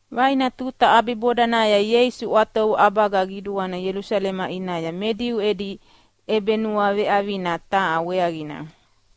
Vaina tuta ʼabibodanaya Ieisu ʼwatovu ʼabaga qiduana Ielusalema ʼinaya me Diu edi ʼebenuaveʼavina taha weaqina.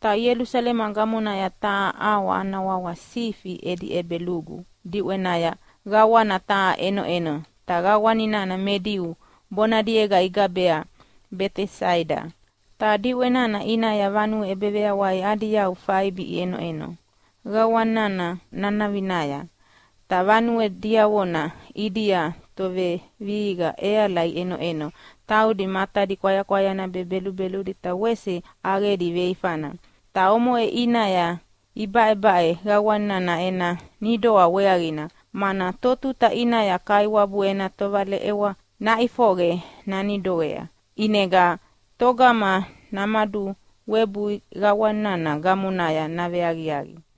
Ta Ielusalema gamonaya taha ʼawa ana wawa Sifi edi ʼEbelugu diʼwenaya qawana taha ʼenoʼeno, ta qawana nana me Diu bonadiega igabea Betesaida. Ta diʼwe nana ʼinaya vanue ʼebeveyawai adi yau faibi iʼenoʼeno qawana nana nanavinaya. Ta vanue diavona ʼidia tovevihiqa ʼeala iʼenoʼeno taudi matadi kwayakwayana be belubeludi ta wese ʼaqedi veifana. Ta omoʼe ʼinaya ibaʼebaʼe qawana nana ena nidoa weaqina, mana totuta ʼinaya Kaiwabu ena tovaleʼewa naʼifoqe nanidoea, ʼinega togama namaduvawebui qawana nana gamonaya naveaqiaqi.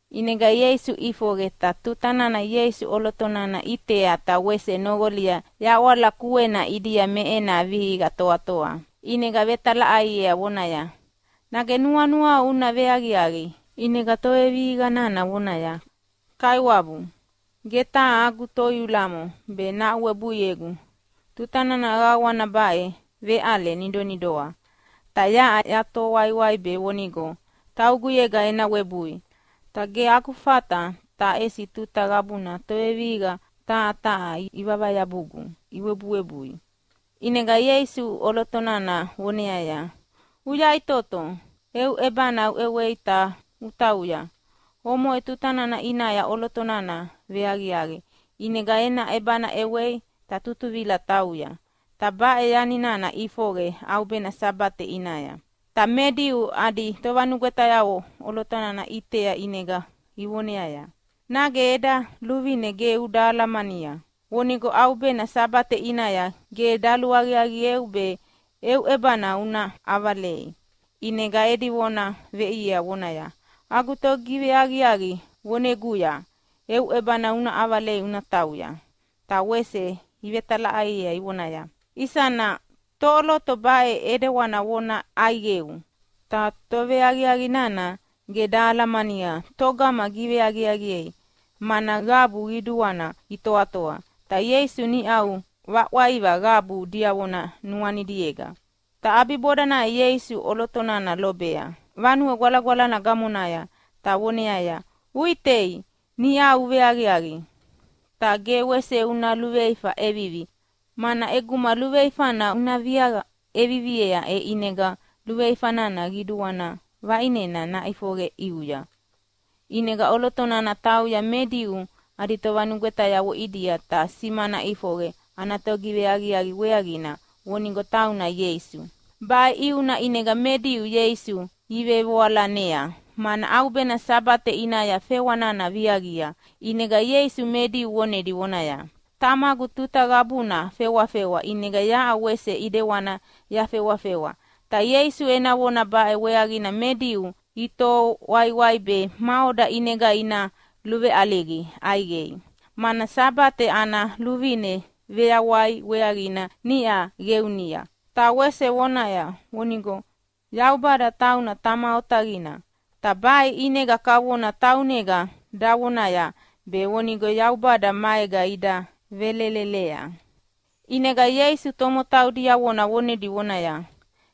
ʼInega Ieisu ʼifoqe, ta tuta nana Ieisu ʼoloto nana ʼitea ta wese noqolia yaʼwala kuena ʼidia me ena vihiqa toatoa, ʼinega vetalaʼaiea vonaya, “Nage nuanuau una veaqiaqi?” ʼInega tovevihiqa nana vonaya, “Kaiwabu, ge taha agu toiulamo be nahaʼuwebuiegu tuta nana qawana baʼe veʼale nidonidoa. Ta yaʼa yatoho waiwai be vonigo tauguyega ena webui, ta ge agu fata, ta ʼesi tuta qabuna tovevihiqa taha taha ivavayabugu iwebuwebui.” ʼInega Ieisu ʼoloto nana voneaya, “Uyaʼitoto, eu ʼebana uʼewei ta utauya!” Omoʼe tuta nana ʼinaya ʼoloto nana veaqiaqi, ʼinega ena ʼebana ʼewei ta tutuvila tauya. Ta baʼe yani nana ʼifoqe ʼaubena Sabate ʼinaya. Ta me Diu adi tovanugwetayavo ʼoloto nana iʼitea ʼinega ivoneaya, “Nage eda luvine ge uda alamania vonigo ʼaubena Sabate ʼinaya ge daluaqiaqieu be eu ʼebana una ʼavalei?” ʼInega edi vona veʼiea vonaya, “Agu togiveaqiaqi voneguya, ‘Eu ʼebana uʼavala utauya!’” Ta wese ivetalaʼaiea ivonaya, “Isana toʼoloto baʼe ʼidewana vona ʼaiqeu?” Ta toveaqiaqi nana ge dahalamania togama giveaqiaqiea, mana qabu qiduana itoatoa, ta Ieisu niʼau vaʼwaiva qabu diavona nuanidiega. Ta ʼabibodanaya Ieisu ʼoloto nana lobea Vanue Gwalagwalana gamonaya ta voneaya, “Uʼitei, niʼau uveaqiaqi, ta ge wese una luveifa ʼevivi. Mana ʼeguma luveifana una viaqa ʼeviviea e ʼinega luveifana qidua vaʼinena naʼifoqe ʼiuya.” ʼInega ʼoloto nana tauya me Diu adi tovanugwetayavo ʼidia ta simana ʼifoqe ana togiveaqiaqi weaqina vonigo tauna Ieisu. Baʼe ʼiuna ʼinega me Diu Ieisu ivevoalanea, mana ʼaubena Sabate ʼinaya fewa nana viaqia. ʼInega Ieisu me Diu vonedi vonaya, “Tamagu tuta qabuna fewafewa, ʼinega yaʼa wese ʼidewani yafewafewa.” Ta Ieisu ena vona baʼe weaqina me Diu itoho waiwai be maʼoda ʼinega ina luveʼaliga ʼaiqei. Mana Sabate ana luvine veyawai weaqina niʼa qeunia, ta wese vonaya vonigo Yaubada tauna Tama otaqina. Ta baʼe ʼinega kavona taunega davonaya be vonigo Yaubada maega ida velelelea. ʼInega Ieisu tomotau diavona vonedi vonaya,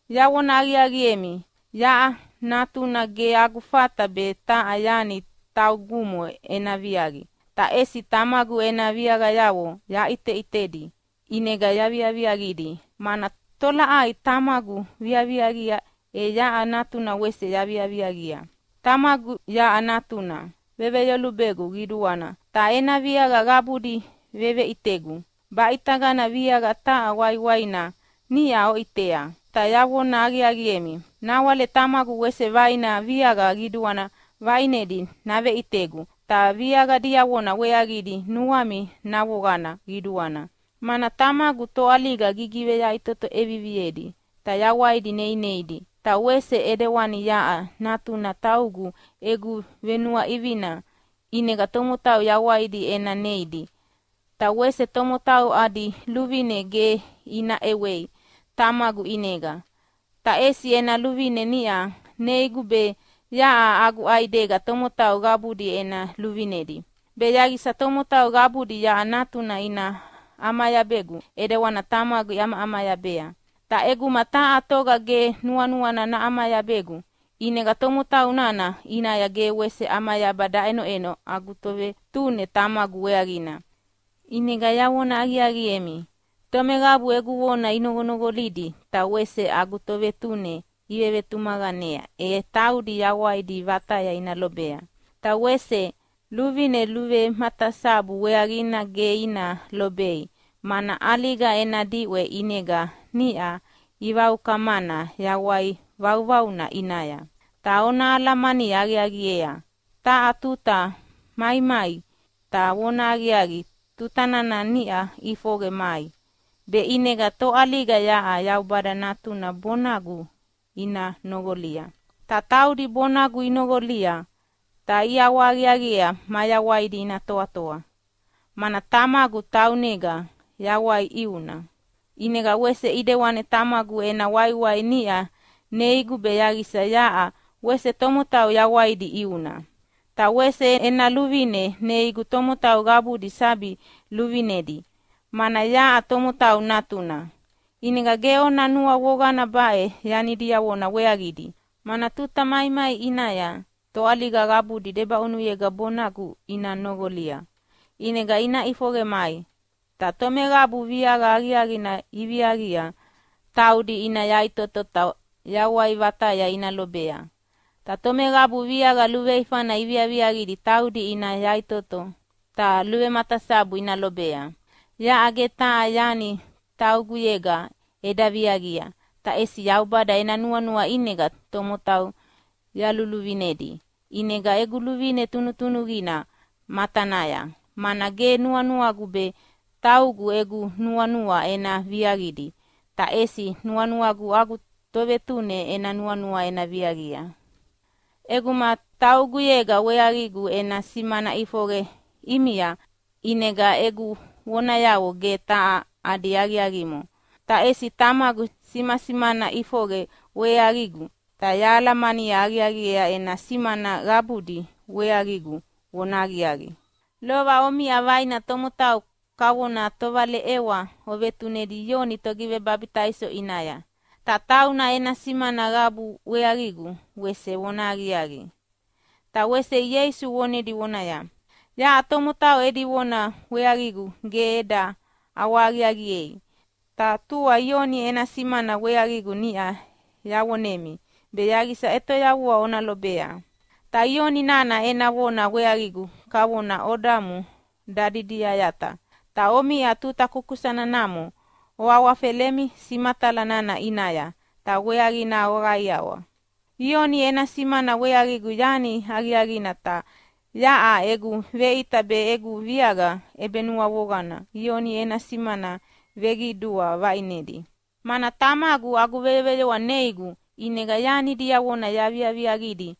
“Yavona aqiaqiemi, yaʼa Natuna ge agu fata be taha yani taugumo ena viaqi, ta ʼesi Tamagu ena viaqayavo yaʼiteʼitedi ʼinega yaviaviaqidi, mana tolaʼai Tamagu viaviaqia e yaʼa Natuna wese yaviaviaqia. Tamagu yaʼa Natuna veveyolubegu qiduana, ta ena viaqa qabudi veveʼitegu. Baʼitagana viaqa taha waiwaina niʼa oʼitea, ta yavona aqiaqiemi, nawale Tamagu wese vaina viaqa qidua vaʼinedi naveʼitegu, ta viaqa diavona weaqidi nuami navoqana qiduana, mana Tamagu toʼaliga gigiveyaʼitoto ʼeviviedi ta yawaidi neineidi, ta wese ʼidewani yaʼa Natuna taugu egu venuaʼivina ʼinega tomotau yawaidi ena neidi. “Ta wese tomotau adi luvine ge ina ʼewei Tamagu ʼinega, ta ʼesi ena luvine niʼa neigu be yaʼa agu ʼaidega tomotau qabudi ena luvinedi, be yaqisa tomotau qabudi yaʼa Natuna ina ʼamayabegu ʼidewani Tamagu iʼamayabea. Ta ʼeguma taha toga ge nuanuana naʼamayabegu ʼinega tomotau nana ʼinaya ge wese ʼamayaba daʼenoʼeno agu Tovetune Tamagu weaqina. “ʼInega yavona aqiaqiemi, tomeqabu egu vona inoqonoqolidi ta wese agu Tovetune ivevetumaqanea e taudi yawaidi vataya ina lobea. Ta wese luvine luvematasabu weaqina ge ina lobei, mana ʼaliga ena diʼwe ʼinega niʼa ivaukamana yawai vauvauna ʼinaya. Ta ona alamani aqiaqiea taha tuta maimai, ta vonahaqiaqi tuta nana niʼa ʼifoqe mai, be ʼinega toʼaliga yaʼa Yaubada Natuna bonagu ina noqolia. Ta taudi bonagu inoqolia ta iʼawahaqiaqiea mayawaidi ina toatoa, mana Tamagu taunega yawai ʼiuna, ʼinega wese ʼidewani Tamagu ena waiwai niʼa neigu be yaqisa yaʼa wese tomotau yawaidi ʼiuna. Ta wese ena luvine neigu tomotau qabudi sabi luvinedi, mana yaʼa Tomotau Natuna. “ʼInega ge ona nuavoqana baʼe yani diavona weaqidi, mana tuta maimai ʼinaya toʼaliga qabudi debaʼunuyega bonagu ina noqolia. ʼInega ina ʼifoqe mai, ta tomeqabu viaqa aqiaqina iviaqia taudi ina yaʼitoto ta yawai vataya ina lobea, ta tomeqabu viaqa luveifana iviaqidi taudi ina yaʼitoto ta luvematasabu ina lobea. Yaʼa ge taha yani tauguyega eda viaqia, ta ʼesi Yaubada ena nuanua ʼinega tomotau yaluluvinedi, ʼinega egu luvine tunutunuqina matanaya. Mana ge nuanuagu be taugu egu nuanua ena viaqidi, ta ʼesi nuanuagu agu Tovetune ena nuanua ena viaqia. “ʼEguma tauguyega weaqigu ena simana ʼifoqe ʼimia, ʼinega egu vonayavo ge taha adi aqiaqimo. Ta ʼesi Tamagu simasimana ʼifoqe weaqigu, ta yahalamani aqiaqiea ena simana qabudi weaqigu vonahaqiaqi. “Lova omiʼa vaina tomotau kavona tovaleʼewa ovetunedi Ioni Togivebabitaiso ʼinaya, ta tauna ena simana qabuna weaqigu wese vonahaqiaqi.” Ta wese Ieisu vonedi vonaya, “Yaʼa tomotau edi vona weaqigu ge eda ʼawahaqiaqiei, ta tua Ioni ena simana weaqigu niʼa yavonemi be yaqisa ʼetoyavua ona lobea. Ta Ioni nana ena vona weaqigu kavona odamu dadidiyayata, ta omiʼa tuta kukusana namo oawafelemi simatala nana ʼinaya ta weaqina oqaiawa. Ioni ena simana weaqigu yani aqiaqina, ta yaʼa egu veʼita be egu viaqa ʼebenuavoqana Ioni ena simana veqidua vaʼinedi, mana Tamagu agu veyoveyoa neigu ʼinega yani diavona yaviaviaqidi.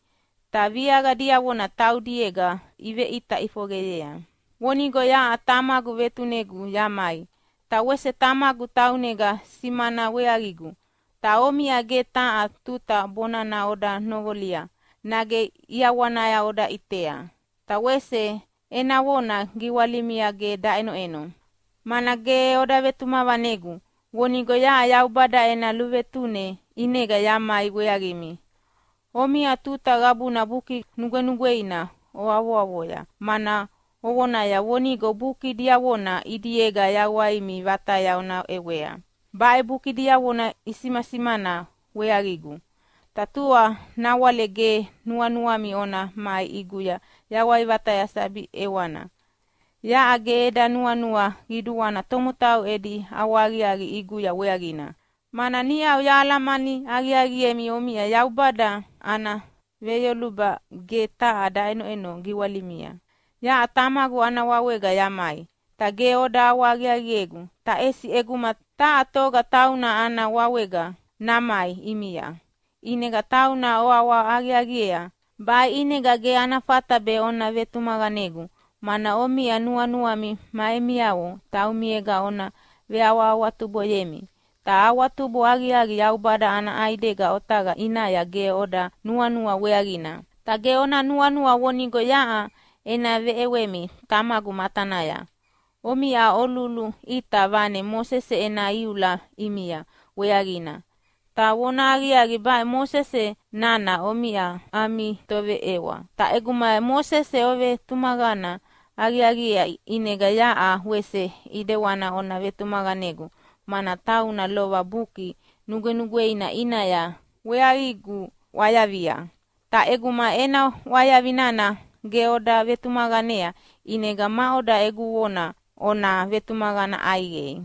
Ta viaqa diavona taudiega iveʼita ʼifoqeyea vonigo yaʼa Tamagu vetunegu yamai. “Ta wese Tamagu taunega simana weaqigu, ta omiʼa ge taha tuta bonana oda noqolia nage ʼiawana oda ʼitea, ta wese ena vona giwalimia ge daʼenoʼeno, mana ge oda vetumaqanegu vonigo yaʼa Yaubada ena luvetune ʼinega yamai weaqimi. “Omiʼa tuta qabuna Buki Nugwenugweina oavoavoya, mana ovonaya vonigo buki diavona ʼidiega yawaimi vataya ona ʼewea. Baʼe buki diavona isimasimana weaqigu, ta tua nawale ge nuanuami ona mai ʼiguya yawai vataya sabi ʼewana. Yaʼa ge eda nuanua qiduana tomotau edi ʼawahaqiaqi ʼiguya weaqina, mana niʼau yahalamani aqiaqiemi omiʼa Yaubada ana veyoluba ge taha daʼenoʼeno giwalimia. “Yaʼa Tamagu ana wawega yamai, ta ge oda ʼawahaqiaqiegu. Ta ʼesi ʼeguma taha toga tauna ana wawega namai ʼimia, ʼinega tauna oʼawaʼawa aqiaqiea. Baʼe ʼinega ge ana fata be ona vetumaqanegu, mana omiʼa nuanuami ma emiavo taumiega ona veawahawatuboyemi, ta awatubo aqiaqi Yaubada ana ʼaidega otaqa ʼinaya ge oda nuanua weaqina. “Ta ge ona nuanua vonigo yaʼa ena veʼewemi Tamagu matanaya. Omiʼa oluluʼita vane Mosese ena iula ʼimia weaqina, ta vonahaqiaqi baʼe Mosese nana omiʼa ami toveʼewa. Ta ʼeguma Mosese ovetumaqana aqiaqiea ʼinega yaʼa wese ʼidewana ona vetumaqanegu, mana tauna lova Buki Nugwenugweina ʼinaya weaqigu ʼwayavia. Ta ʼeguma ena ʼwayavi nana ge oda vetumaqanea, ʼinega maʼoda egu vona ona vetumaqana ʼaiqei?”